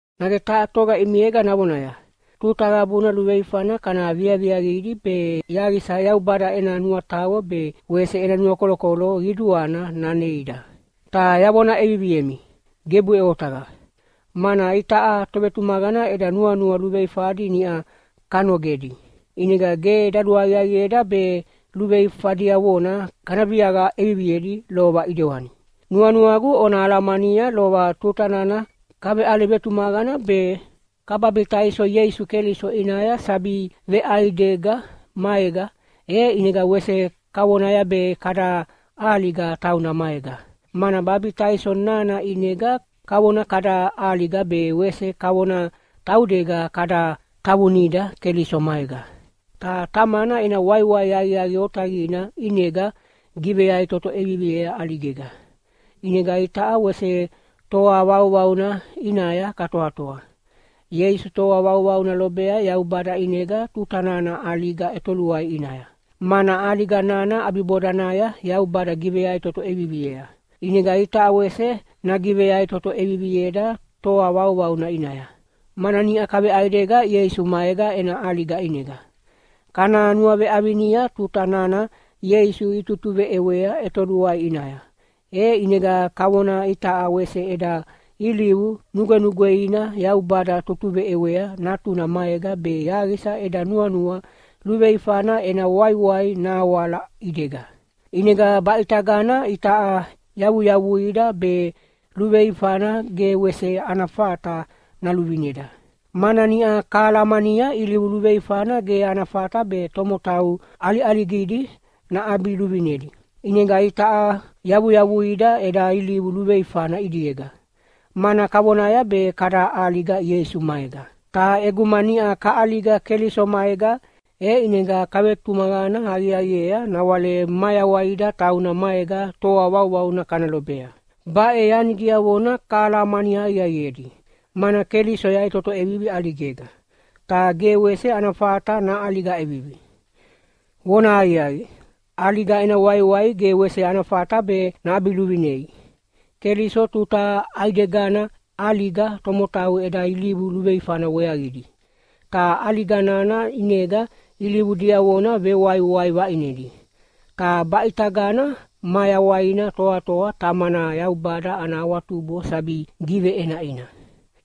Nage taha toga ʼimiega navonaya, “Tuta qabuna luveifana kana viaviaqidi be yaqisa Yaubada ena nuataqo be wese ena nuakolokolo qiduana naneida.” Ta yavona ʼeviviemi, gebuʼe otaqa! Mana itaʼa tovetumaqana eda nuanua luveifadi niʼa kanogedi, ʼinega ge daluaqiaqieda be luveifa diavona kana viaqa ʼeviviedi lova ʼidewani. Nuanuagu ona alamania lova tuta nana kaveʼale vetumaqana be kababitaiso Ieisu Keliso ʼinaya sabi veʼaidega maega, e ʼinega wese kavonaya be kada ʼaliga tauna maega. Mana babitaiso nana ʼinega kavona kada ʼaliga be wese kavona taudega kada tavunida Keliso maega. Ta Tamana ena waiwai aqiaqi otaqina ʼinega giveyaʼitoto ʼeviviea ʼaligega. ʼInega itaʼa wese toa vauvauna ʼinaya katoatoa. Ieisu toa vauvauna lobea Yaubada ʼinega tuta nana ʼaliga ʼetoluai ʼinaya, mana ʼaliga nana ʼabibodanaya Yaubada giveyaʼitoto ʼeviviea. ʼInega itaʼa wese nagiveyaʼitoto ʼevivieda toa vauvauna ʼinaya, mana niʼa kaveʼaidega Ieisu maega ena ʼaliga ʼinega. Kana nuaveʼavinia tuta nana Ieisu itutuveʼewea ʼetoluai ʼinaya, e ʼinega kavona itaʼa wese eda ilivu nugwenugweina Yaubada tutuveʼewea Natuna maega be yaqisa eda nuanua luveifana ena waiwai nahawala ʼidega. ʼInega baʼitagana itaʼa yavuyavuida be luveifana ge wese ana fata naluvineda. Mana niʼa kahalamania ilivu luveifana ge ana fata be tomotau ʼaliʼaligidi naʼabiluvinedi. ʼInega itaʼa yavuyavuida eda ilivu luveifana ʼidiega, mana kavonaya be kada ʼaliga Ieisu maega. Ta ʼeguma niʼa kaʼaliga Keliso maega, e ʼinega kavetumaqana aqiaqiea nawale mayawaida tauna maega toa vauvauna kana lobea. Baʼe yani diavona kahalamani aqiaqiedi, mana Keliso yaʼitoto ʼevivi ʼaligega, ta ge wese ana fata naʼaliga ʼevivi. Vonahaqiaqi, ʼaliga ena waiwai ge wese ana fata be naʼabiluvinei. Keliso tuta ʼaidegana ʼaliga tomotau eda ilivu luveifana weaqidi. Ta ʼaliga nana ʼinega ilivu diavona vewaiwai vaʼinedi. Ta baʼe ʼitagana mayawaina toatoa Tamana Yaubada ana awatubo sabi giveʼenaʼina.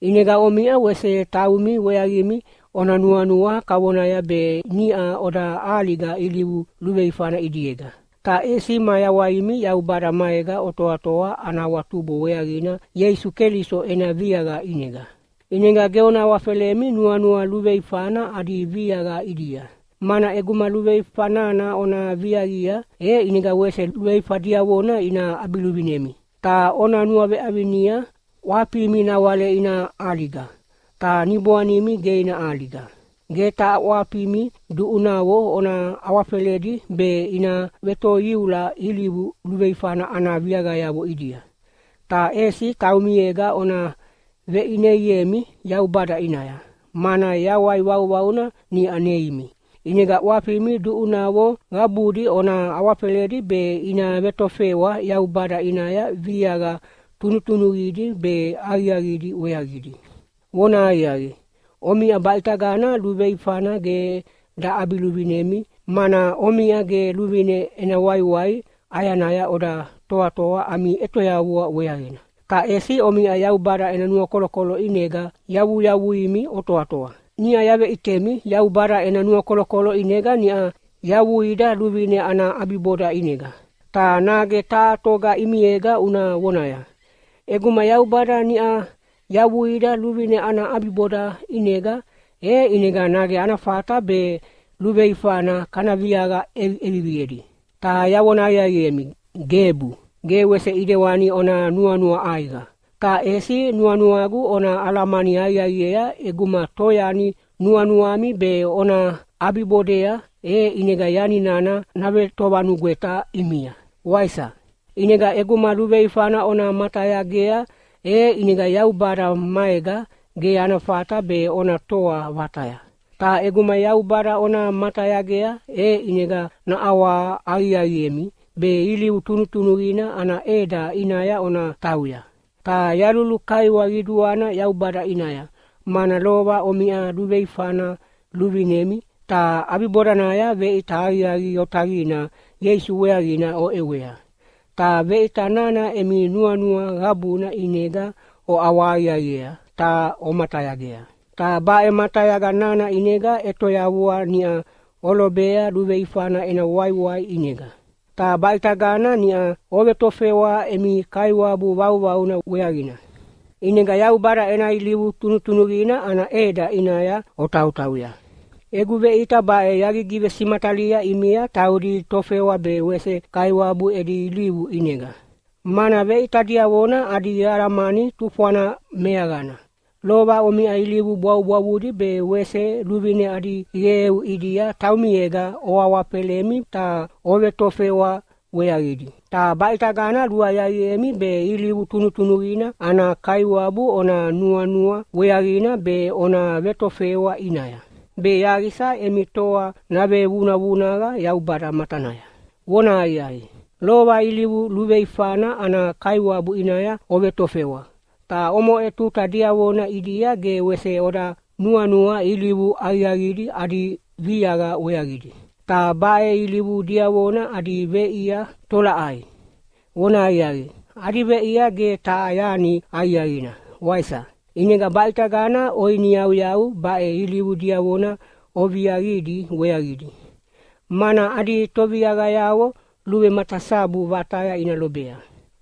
ʼInega omiʼa wese taumi weaqimi ona nuanua kavonaya be niʼa oda ʼaliga ilivu luveifana ʼidiega, ta ʼesi mayawaimi Yaubada maega otoatoa ana awatubo weaqina Ieisu Keliso ena viaqa ʼinega. ʼInega ge ona awafelemi nuanua luveifana adi viaqa ʼidia, mana ʼeguma luveifa nana ona viaqia, e ʼinega wese luveifa diavona ina ʼabiluvinemi. Ta ona nuaveʼavinia ʼwafimi nawale ina ʼaliga, ta niboanimi ge ina ʼaliga. Ge taha ʼwafimi duʼunavo ona awafeledi be ina vetoiula ilivu luveifana ana viaqayavo ʼidia. Ta ʼesi taumiega ona veʼineiemi Yaubada ʼinaya, mana yawai vauvauna niʼa neimi. ʼInega ʼwafimi duʼunavo qabudi ona awafeledi be ina vetofewa Yaubada ʼinaya viaqa tunutunuqidi be aqiaqidi weaqidi. Vonahaqiaqi, omiʼa baʼitagana luveifana ge daʼabiluvinemi, mana omiʼa ge luvine ena waiwai ʼayanaya oda toatoa ami ʼetoyavua weaqina. Ta ʼesi omiʼa Yaubada ena nuakolokolo ʼinega yavuyavuimi otoatoa. Niʼa yaveʼitemi Yaubada ena nuakolokolo ʼinega niʼa yavuida luvine ana ʼabiboda ʼinega. Ta nage taha toga ʼimiega una vonaya, “ʼEguma Yaubada niʼa yavuida luvine ana ʼabiboda ʼinega, e ʼinega nage ana fata be luveifana kana viaqa ʼeviʼeviviedi?” Ta yavona aqiaqiemi, gebu. Ge wese ʼidewani ona nuanua ʼaiqa! Ta ʼesi nuanuagu ona alamani aqiaqiea ʼeguma toyani nuanuami be ona ʼabibodea, e ʼinega yani nana navetovanugweta ʼimia, waisa? ʼInega ʼeguma luveifana ona matayagea, e ʼinega Yaubada maega ge ana fata be ona toa vataya. Ta ʼeguma Yaubada ona matayagea, e ʼinega naʼawahaqiaqiemi be ilivu tunutunuqina ana ʼeda ʼinaya ona tauya. Ta yalulukaiwa qiduana Yaubada ʼinaya, mana lova omiʼa luveifana luvinemi, ta ʼabibodanaya veʼita aqiaqi otaqina Ieisu weaqina oʼewea, ta veʼita nana emi nuanua qabuna ʼinega oʼawahaqiaqiea ta omatayagea. Ta baʼe matayaga nana ʼinega ʼetoyavua niʼa olobea luveifana ena waiwai ʼinega, ta baʼitagana niʼa ovetofewa emi Kaiwabu vauvauna weaqina, ʼinega Yaubada ena ilivu tunutunuqina ana ʼeda ʼinaya otautauya. Egu veʼita baʼe yagigivesimatalia ʼimia taudi tofewa be wese kaiwabu edi ilivu ʼinega, mana veʼita diavona adi alamani tufwana meaqana. Lova omiʼa ilivu bwavubwavudi be wese luvine adi qeu ʼidia taumiega oawafelemi ta ovetofewa weaqidi. Ta baʼitagana luaqiaqiemi be ilivu tunutunuqina ana Kaiwabu ona nuanua weaqina be ona vetofewa ʼinaya, be yaqisa emi toa navevunavunaqa Yaubada matanaya. Vonahaqiaqi, lova ilivu luveifana ana kaiwabu ʼinaya ovetofewa, ta omoʼe tuta diavona ʼidia ge wese oda nuanua ilivu aqiaqidi adi viaqa weaqidi. Ta baʼe ilivu diavona adi veʼia tolaʼai? Vonahaqiaqi, adi veʼia ge taha yani aqiaqina, waisa? ʼInega baʼitagana oiniyauyau baʼe ilivu diavona oviaqidi weaqidi, mana adi toviaqayavo luvematasabu vataya ina lobea.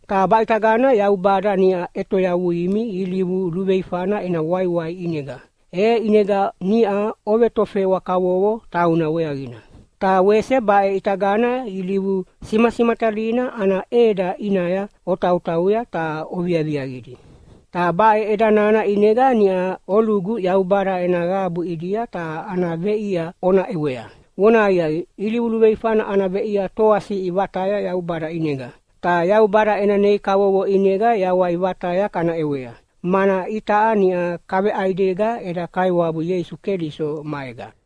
Ta baʼitagana Yaubada niʼa ʼetoyavuimi ilivu luveifana ena waiwai ʼinega, e ʼinega niʼa ovetofewa kavovo tauna weaqina. Ta wese baʼe ʼitagana ilivu simasimatalina ana ʼeda ʼinaya otautauya ta oviaviaqidi, ta baʼe ʼeda nana ʼinega niʼa olugu Yaubada ena qabu ʼidia ta ana veʼia yawai vataya ona ʼewea. Vonahaqiaqi, ilivu luveifana ana veʼia toasiʼi vataya Yaubada ʼinega. Ta Yaubada ena nei kavovo ʼinega yawai vataya kana ʼewea, mana itaʼa niʼa kaveʼaidega eda Kaiwabu Ieisu Keliso maega.